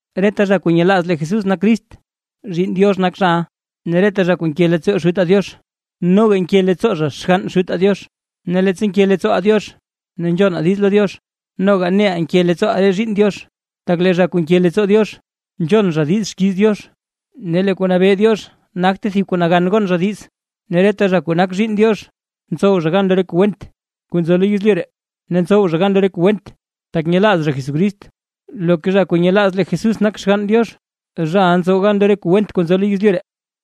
Reta zha kuu nyelaaz lee Jesús nak Crist, zhiinn Diox nak zhaʼa. Ne reta zha kuu nke leettsoo Xutaa Diox, noga nke leettsoo zha xgann Xutaa Diox. Ne leettsa nke leettsooʼaa Diox ne nzhonaa diiz lo Diox, noga neʼaa nke leettsooʼaa re zhiinn Diox, tak lee zha kuu nke leettsoo Diox, nzhon zha diiz xkiiz Diox; ne lee kuu nabee Diox nagte thib kuu nagan gon zha diiz, ne reta zha kuu nak zhiinn Diox, ntsow zha gan lo re kuu went kuu nzo lo yezlyu ree; ne ntsow zha gan lo re kuu went, tak nyelaaz zha Jesucrist. Loka zha kuu nyelaaz lee Jesús nak Xgann Diox, zhaʼa ntsow gan lo re kuu went kuu nzo lo yezlyu ree.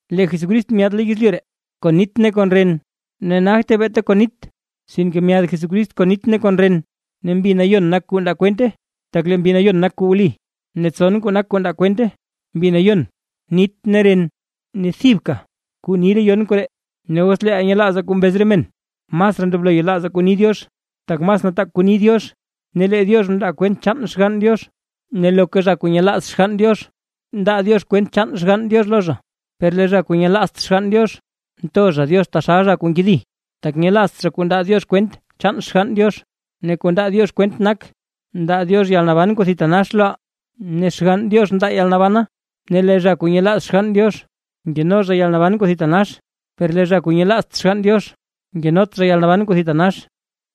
Lee Jesucrist myaad lo yezlyu ree kon nit ne kon ren; ne nagte beeta kon nit, sinke myaad Jesucrist kon nit ne kon ren. Ne Mbi Nayon nak kuu ndaa kwente, tak lee Mbi Nayon nak kuu wli. Ne tson kuu nak kuu ndaa kwente: Mbi Nayon, nit ne ren; ne thibka kuu ni re yon koree. Ne os leeʼaa nyelaazaa kuu mbez re men; masraa ndoblo yelaazaa kuu ni Diox, tak mas nataak kuu ni Diox, ne lee Diox mndaa kwent chaan Xgann Diox. Ne loka zha kuu nyelaaz Xgann Diox, ndaa Diox kwent chaan Xgann Diox lo zha. Per lee zha kuu nyelaazt Xgann Diox, nto zha Diox taxal zha kuu nkedi, tak nyelaazt zha kuu ndaa Diox kwent chaan Xgann Diox. Ne kuu ndaa Diox kwent nak: Ndaa Diox yalnaban kuu thitanax loʼaa, ne Xgann Diox ndaa yalnabana. Ne lee zha kuu nyelaaz Xgann Diox, nkeno zha yalnaban kuu thitanax; per lee zha kuu nyelaazt Xgann Diox, nkenot zha yalnaban kuu thitanax.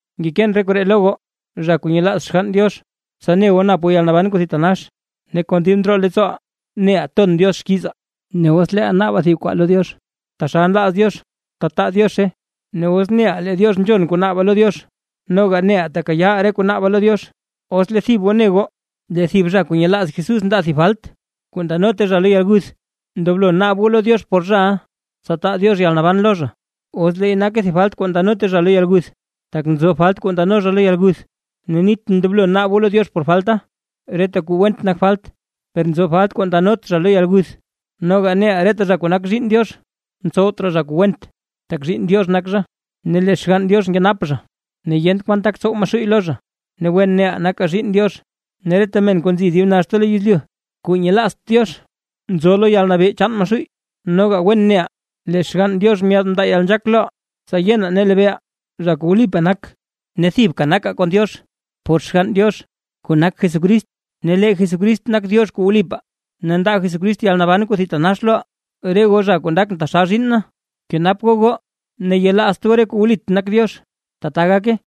Ngekeen re koree lo goo, zha kuu nyelaaz Xgann Diox, tsa ne goo nap goo yalnaban kuu thitanax. Ne kon dib ndroo leettsooʼaa neʼaa ton Diox xkiizaa, os leeʼaa naabaa thib kuu lo Diox taxal nlaaz Diox, tataa Diozhe. Ne os neʼaa lee Diox nzhon kuu naabaa lo Diox, noga neʼaa tekayaaʼaa re kuu naabaa lo Diox. Os lee thib goo ne goo lee thib zha kuu nyelaaz Jesús ndaa thib falt, kuu ndanote zha lo yalguth, ndoblo naab goo lo Diox por zhaʼa, tsa taa Diox yalnaban lo zha, os leey nake thib falt kuu ndanot zha lo yalguth. Tak nzo falt kuu ndano zha lo yalguth, ne nitʼn ndoblo naab goo lo Diox por falta. Reta kuu went nak falt; per nzo falt kuu ndanot zha lo yalguth. Noga neʼaa reta zha kuu nak zhiinn Diox, ntsowt raa zha kuu went; tak zhiinn Diox nak zha, ne lee Xgann Diox nkenap zha, ne yent kwan tak tsow Maxuuy lo zha. Ne wen neʼaa nakaa zhiinn Diox, ne reta men kuu nzi dib naxta lo yezlyu kuu nyelaazt Diox, nzo lo yalnabee chaan Maxuuy. Noga wen neʼaa lee Xgann Diox myaad mndaa yalnzhaak loʼaa, tsa yenaa ne lebeeʼaa, Zha kuu wlipaa nak. Ne thibka nakaa kon Diox por Xgann Diox, kuu nak Jesucrist. Ne lee Jesucrist nak Diox kuu wlipaa, ne ndaa Jesucrist yalnaban kuu thitanax loʼaa. Re goo zha kuu ndakʼn taxal zhiinn na, kenap goo goo ne yelaazt goo re kuu wlit nak Diox. ¡Tbaa gake! Juan